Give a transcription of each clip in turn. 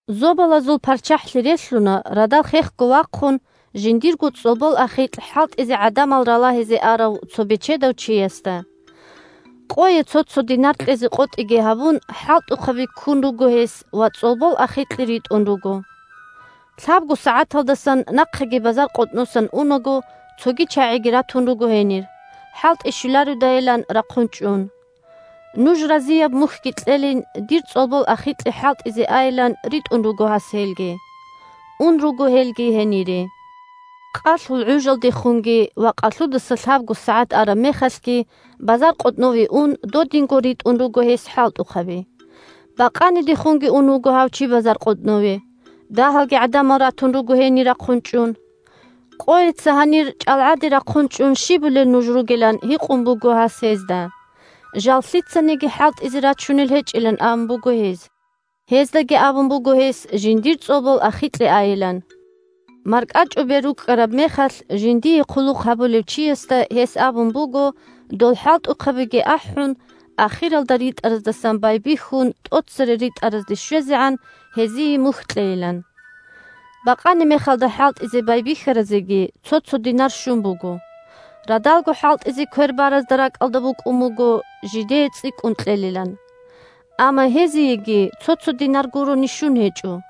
Зобалазул ПарччахӀлъи релълъуна, радал хехго вахъун, жиндирго цӀолбол ахикь хӀалтӀизе гӀадамал ралагьизе арав цо бечедав чиясда. Къое цо-цо динар кьезе къотӀиги гьабун, хӀалтӀухъаби ккун руго гьес ва цӀолбол ахикье ритӀун руго. Лъабго сагӀаталдасан нахъеги базаркъотӀносан унаго, цоги чагӀиги ратун руго гьенир, хӀалтӀи щвелародайилан рахъун чӀун. Нуж разияб мухьги кьелин, дир цӀолбол ахикье хӀалтӀизе айилан ритӀун руго гьас гьелги. Ун руго гьел гьенире. Къалъул гӀужалдехунги ва къалъудаса лъабго сагӀат араб мехалъги базаркъотӀнове ун, додинго ритӀун руго гьес хӀалтӀухъаби. Бакъанидехунги ун вуго гьав чи базаркъотӀнове. Дагьалги гӀадамал ратун руго гьенир рахъун чӀун. – Къойица гьанир чӀалгӀаде рахъун чӀун щибулел нуж ругел? – ан гьикъун буго гьас гьезда. Жал лъицаниги хӀалтӀизе рачунел гьечӀилан абун буго гьез. Гьездаги абун буго гьес жиндир цӀолбол ахикье айилан. МаркӀачӀубер рукӀкӀараб мехалъ, жиндие хъулухъ гьабулев чиясда гьес абун буго дол хӀалтӀухъабиги ахӀун, ахиралда ритӀараздасан байбихьун тӀоцере ритӀаразде щвезегӀан гьезие мухь кьейилан. Бакъанимехалда хӀалтӀизе байбихьаразеги цо-цо динар щун буго. Радалго хӀалтӀизе квер баразда ракӀалда букӀун буго жидее цӀикӀкӀун кьелилан. Амма гьезиеги цо-цо динар гурони щун гьечӀо.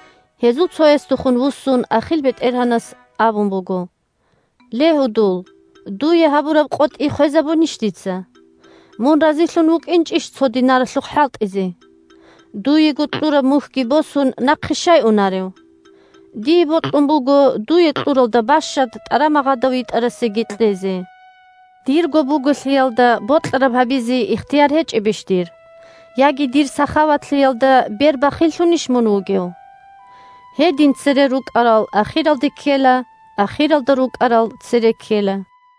Гьезул цоясдехун вуссун ахил бетӀергьанас абун буго: – Ле, гьудул! Дуе гьабураб къотӀи хвезабунищ дица? Мун разилъун вукӀинчӀищ цо динаралъухъ хӀалтӀизе? Дуего кьураб мухьги босун нахъе щай унарев? Дие бокьун буго дуе кьуралда бащад тӀарамагъада витӀарасеги кьезе. Дирго буголъиялда бокьараб гьабизе ихтияр гьечӀебищ дир? Яги дир сахаватлъиялда бер бахиллъунищ мун вугев? Гьедин цере рукӀарал ахиралде ккела, ахиралда рукӀарал цере ккела.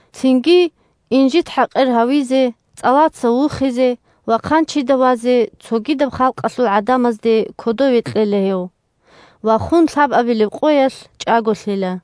Цинги инжит-хӀакъир гьавизе, цӀалаца вухизе ва хъанчида вазе цогидаб халкъалъул гӀадамазда кодове кьела гьев. Ва хун лъабабилеб къоялъ чӀаголъила.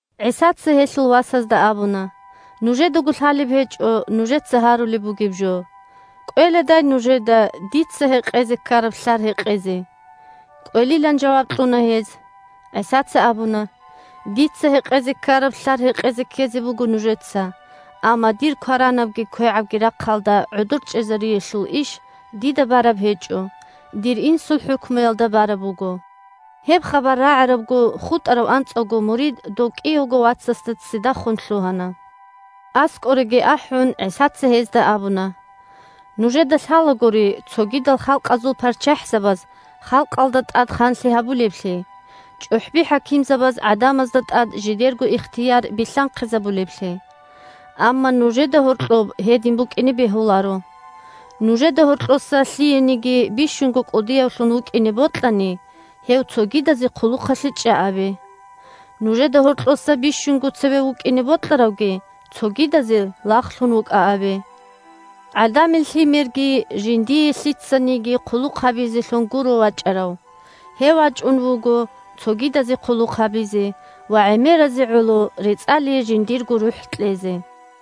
ГӀисаца гьелъул васазда абуна: – Нужедаго лъалеб гьечӀо нужеца гьарулеб бугеб жо. КӀвеладай нужеда дица гьекъезе ккараб лълъар гьекъезе? КӀвелилан жаваб кьуна гьез. ГӀисаца абуна: – Дица гьекъезе ккараб лълъар гьекъезе ккезе буго нужеца. Амма дир кваранабги квегӀабги рахъалда гӀодор чӀезариялъул иш дида бараб гьечӀо, дир Инсул хӀукмуялда бараб буго. Гьеб хабар рагӀарабго, хутӀарав анцӀавго мурид дов кӀиявго вацасде ццидахун лъугьана. АскӀореги ахӀун, ГӀисаца гьезда абуна: – Нужеда лъалагури цогидал халкъазул парччахӀзабаз халкъалда тӀад ханлъи гьабулеблъи, чӀухӀби-хӀакимзабаз гӀадамазда тӀад жидерго ихтияр билълъанхъизабулеблъи. Амма нужеда гьоркьоб гьедин букӀине бегьуларо. Нужеда гьоркьоса лъиениги бищунго кӀудиявлъун вукӀине бокьани, гьев цогидазе хъулухъалъе чӀа абе. Нужеда гьоркьоса бищунго цеве вукӀине бокьаравги цогидазе лагълъун вукӀа абе. ГӀадамил Лъимерги жиндие лъицаниги хъулухъ гьабизелъун гуро вачӀарав. Гьев вачӀун вуго цогидазе хъулухъ гьабизе ва гӀемеразе гӀоло рецӀалие жиндирго рухӀ кьезе.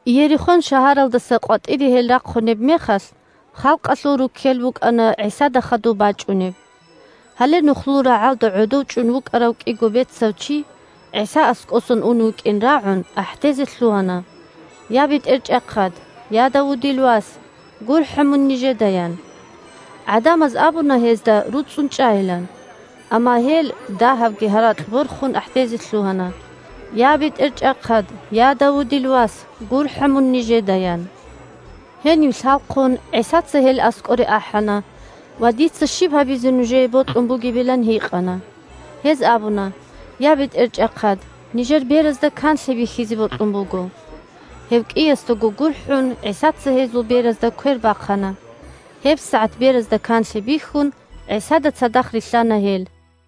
Иерихон шагьаралдаса къватӀире гьел рахъунеб мехалъ, халкъалъул руккел букӀана ГӀисада хадуб бачӀунеб. Гьале нухлул рагӀалда гӀодов чӀун вукӀарав кӀиго бецав чи, ГӀиса аскӀосан унев вукӀин рагӀун, ахӀдезе лъугьана: – Я, БетӀерчӀахъад! Я, Давудил вас! ГурхӀа мун нижеда! – ян. ГӀадамаз абуна гьезда руцӀцӀун чӀайилан, амма гьел дагьабги гьаракь борхун ахӀдезе лъугьана: – Я, БетӀерчӀахъад! Я, Давудил вас! ГурхӀа мун нижеда! – ян. Гьенив лъалхъун, ГӀисаца гьел аскӀоре ахӀана ва дица щиб гьабизе нужее бокьун бугебилан гьикъана. Гьез абуна: – Я, БетӀерчӀахъад, нижер беразда канлъи бихьизе бокьун буго. Гьев кӀиясдаго гурхӀун, ГӀисаца гьезул беразда квер бахъана. ГьебсагӀат беразда канлъи бихьун, ГӀисада цадахъ рилълъана гьел.